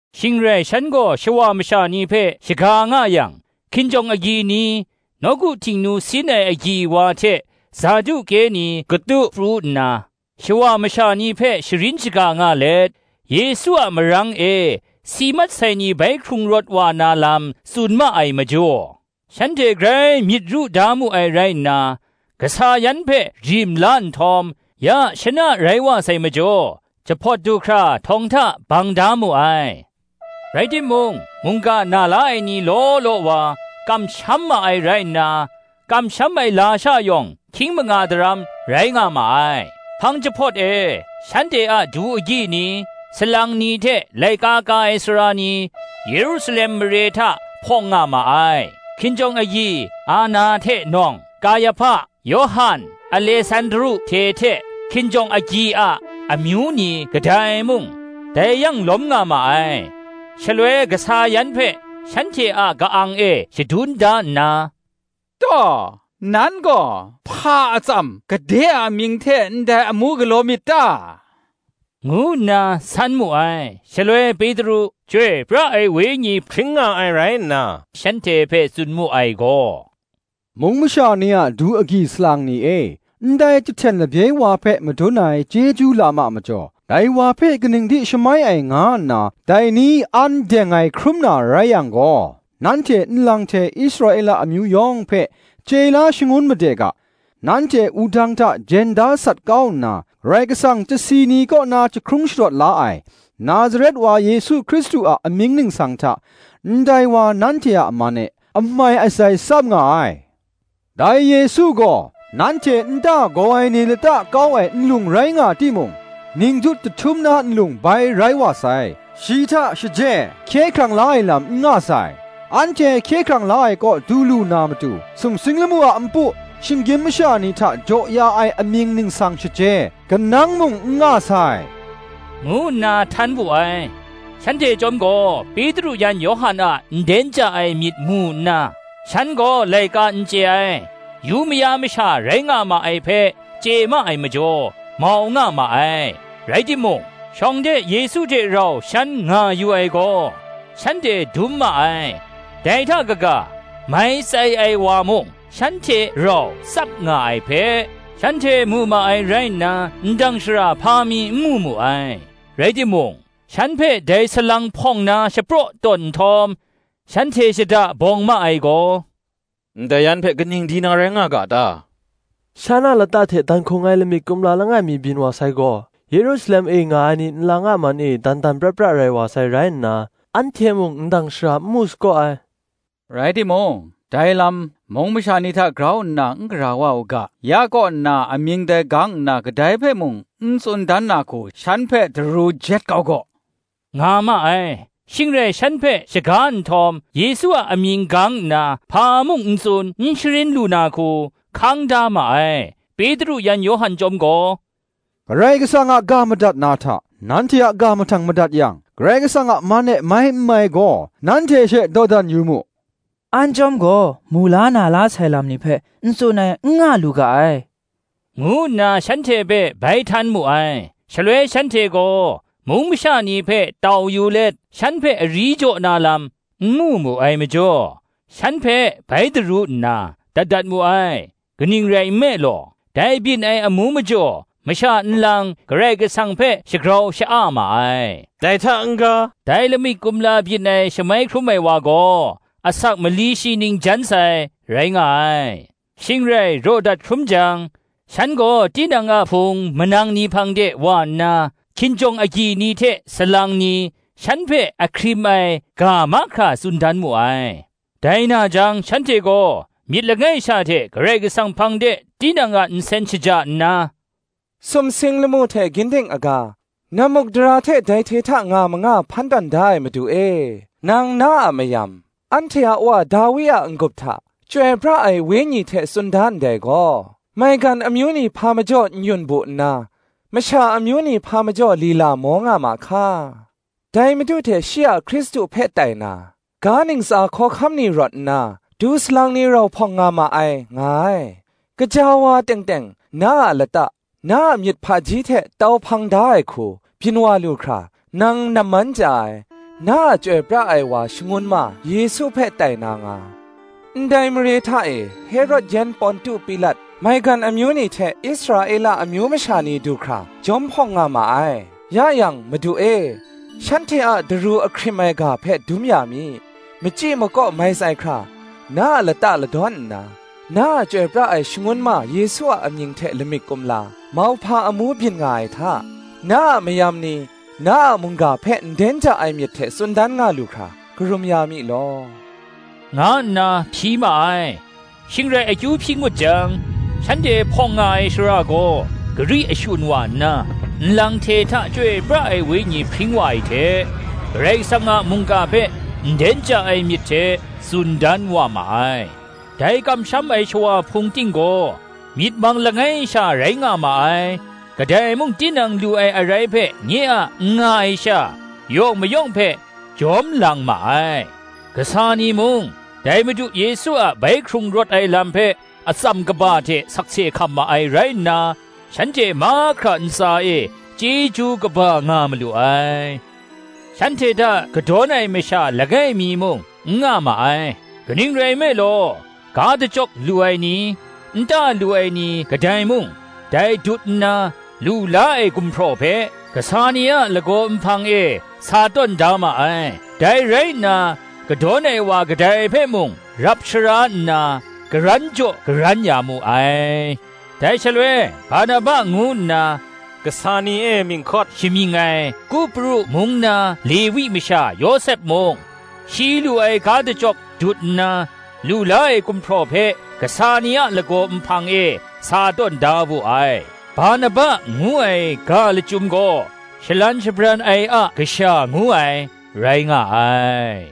Shing rai, shan gaw shawa masha ni hpe shaga nga yang, hkinjawng agyi ni, nawku Htingnu sin ai agyi wa hte Saduke ni katu pru nna shawa masha ni hpe sharin shaga nga let, Yesu a marang e si mat sai ni bai hkrung rawt wa na lam tsun ma ai majaw, shanhte grai myit ru da mu ai rai nna, kasa yan hpe rim la nhtawm, ya shana rai wa sai majaw, jahpawt du hkra htawng hta bang da mu ai. Rai timung, mungga na la ai ni law law wa, kamsham ma ai rai nna, kamsham ai lasha yawng hkying manga daram rai nga ma ai. Hpang jahpawt e, shanhte a du agyi ni, salang ni hte laika ka ai sara ni, Yerusalem mare hta hpawng nga ma ai: hkinjawng agyi Anna hte nawng, Kayahpa, Yawhan, Alesandru hte hte, hkinjawng agyi a amyu ni kadai mung, dai yang lawm nga ma ai. Shaloi kasa yan hpe shanhte a ka-ang e shadun da nna, “Taw, nan gaw, hpa atsam, gade a amying hte ndai amu galaw myit ta?” ngu nna san mu ai. Shaloi Petru, Chyoi pra ai Wenyi hpring nga ai rai nna, shanhte hpe tsun mu ai gaw, “Mung masha ni a du agyi salang ni e, ndai chyahten labye wa hpe madun ai chyeju lam a majaw, dai wa hpe kaning di shamai ai nga nna, dai ni an deng ai hkrum na rai yang gaw, nanhte nlang hte Israela amyu yawng hpe chye la shangun made ga: nanhte wudang hta jen da sat kau nna, Karai Kasang chyasi ni kaw na jahkrung sharawt la ai, Nazaret wa Yesu Hkristu a amying ningsang hta, ndai wa nanhte a man e amai atsai tsap nga ai. Dai Yesu gaw, nanhte nta gaw ai ni lata kau ai nlung rai nga timung, ningjut jahtum na nlung bai rai wa sai. Shi hta shaje hkye krang la ai lam n nga sai; anhte hkye hkrang la kaw du lu na matu, sumsing lamu a npu, shinggyim masha ni hta jaw ya ai amying ningsang shaje, kanang mung n nga sai,” ngu nna htan wu ai. Shanhte chyawm gaw, Petru yan Yawhan a nden ja ai myit mu nna, shan gaw laika n chye ai, yu maya masha rai nga ma ai hpe chye ma ai majaw, mau nga ma ai; rai timung, shawng de Yesu hte rau shan nga yu ai gaw, shanhte dum ma ai: dai hta kaga, mai tsai ai wa mung, shan hte rau tsap nga ai hpe, shanhte mu ma ai rai nna, ndang shara hpa mi n mu mu ai. Rai timung, shan hpe dai salang hpawng na shapraw tawn nhtawm, shanhte shada bawng ma ai gaw, “Ndai yan hpe kaning di na rai nga ga ta? shan a lata hte dan hkung ai lamik kumla langai mi byin wa sai gaw, Yerusalem e nga ai ni nlang a man e dan dan pra pra rai wa sai rai nna, anhte mung ndang shara n mu sagaw ai. Rai timung, dai lam, mung masha ni hta grau nna n gara wa u ga, ya kaw nna amying dai gang nna kadai hpe mung, n tsun dan na hku, shan hpe daru jet kau gaw,” nga ma ai. Shing rai shan hpe shaga nhtawm, Yesu a amying gang nna hpa mung n tsun, n sharin lu na hku, hkang da ma ai. Petru yan Yawhan chyawm gaw, “Karai Kasang a ga madat na hta, nanhte a ga mahtang madat yang, Karai Kasang a man e mai n mai gaw, nanhte she dawdan yu mu. An chyawm gaw, mu la, na la sai lam ni hpe n tsun ai, n nga lu ga ai,” ngu nna shanhte hpe bai htan mu ai. Shaloi shanhte gaw, mung masha ni hpe tau yu let, shan hpe ari jaw na lam n mu mu ai majaw, shan hpe bai daru nna dat dat mu ai; kaning rai nme law, dai byin ai amu majaw, masha nlang Karai Kasang hpe shagrau sha-a ma ai. Dai hta n-ga, dai lamik kumla byin ai shamai hkrum ai wa gaw, asak mali shi ning jan sai, rai nga ai. Shing rai raw dat hkrum jang, shan gaw tinang a hpung manang ni hpang de wa nna, hkinjawng agyi ni hte salang ni, shan hpe ahkrim ai ga mahkra tsun dan mu ai. Dai na jang shanhte gaw myit langai sha hte Karai Kasang hpang de tinang a nsen shaja nna, “Sumsing lamu hte ginding aga, nammukdara hte dai hte hta nga manga hpan tawn da ai Madu e; Nang na a mayam, anhte a wa Dawi a n-gup hta, Chyoi pra ai Wenyi hte tsun da ndai gaw; ‘Maigan amyu ni hpa majaw n-yun bu nna, Masha amyu ni hpa majaw lila maw nga ma hka? Dai Madu hte shi a Hkristu hpe tai na, Ga ntsa hkawhkam ni rawt nna, Du salang ni rau hpawng nga ma ai,' nga ai. Gaja wa teng teng, na a lata, na a myit hpaji hte tau hpang da ai hku, byin wa lu hkra, nang namman chya ai, na a chyoi pra ai wa Shangun ma Yesu hpe tai na nga, ndai mare hta e Herod yan Pontu Pilat, maigan amyu ni hte Israela amyu masha ni du hkra jawm hpawng nga ma ai. Ya yang Madu e, shanhte a daru ahkrim ai ga hpe dum ya mi; machyi makaw mai tsai hkra, na a lata ladawn nna, na a chyoi pra ai Shangun ma Yesu a amying hte lamik kumla, mauhpa amu byin nga ai hta, na a mayam ni, na a mungga hpe nden ja ai myit hte tsun dan nga lu hkra, karum ya mi law,” nga nna hpyi ma ai. Shing rai akyu hpyi ngut jang, shanhte hpawng nga ai shara gaw gari ashun wa nna, nlang hte hta Chyoi pra ai Wenyi hpring wa ai hte, Karai Kasang a mungga hpe nden ja ai myit hte tsun dan wa ma ai. Dai kamsham ai shawa hpung ting gaw myit mang langai sha rai nga ma ai: kadai mung tinang lu ai arai hpe nye a, n nga ai sha, yawng mayawng hpe jawm lang ma ai. Kasa ni mung, dai Madu Yesu a bai hkrung rawt ai lam hpe atsam kaba hte sakse hkam ma ai rai nna, shanhte mahkra ntsa e chyeju kaba nga malu ai. Shanhte hta kadawn ai masha langai mi muk n nga ma ai; kaning rai nme law, ga dachyawk lu ai ni, nta lu ai ni kadai mung, dai dut nna, lu la ai gumhpraw hpe, kasa ni a lagaw nhpang e sa tawn da ma ai; dai rai nna, kadawn ai wa kadai hpe mung rap shara nna, karan jaw karan ya mu ai. Dai shaloi, Barnaba ngu nna, kasa ni e mying hkawt shamying ai, Kupru mung na Lewi masha Yawsep mung, shi lu ai ga dachyawk dut nna, lu la ai gumhpraw hpe kasa ni a lagaw nhpang e sa tawn da wu ai: Barnaba ngu ai ga lachyum gaw shalan shabran ai a kasha ngu ai, rai nga ai.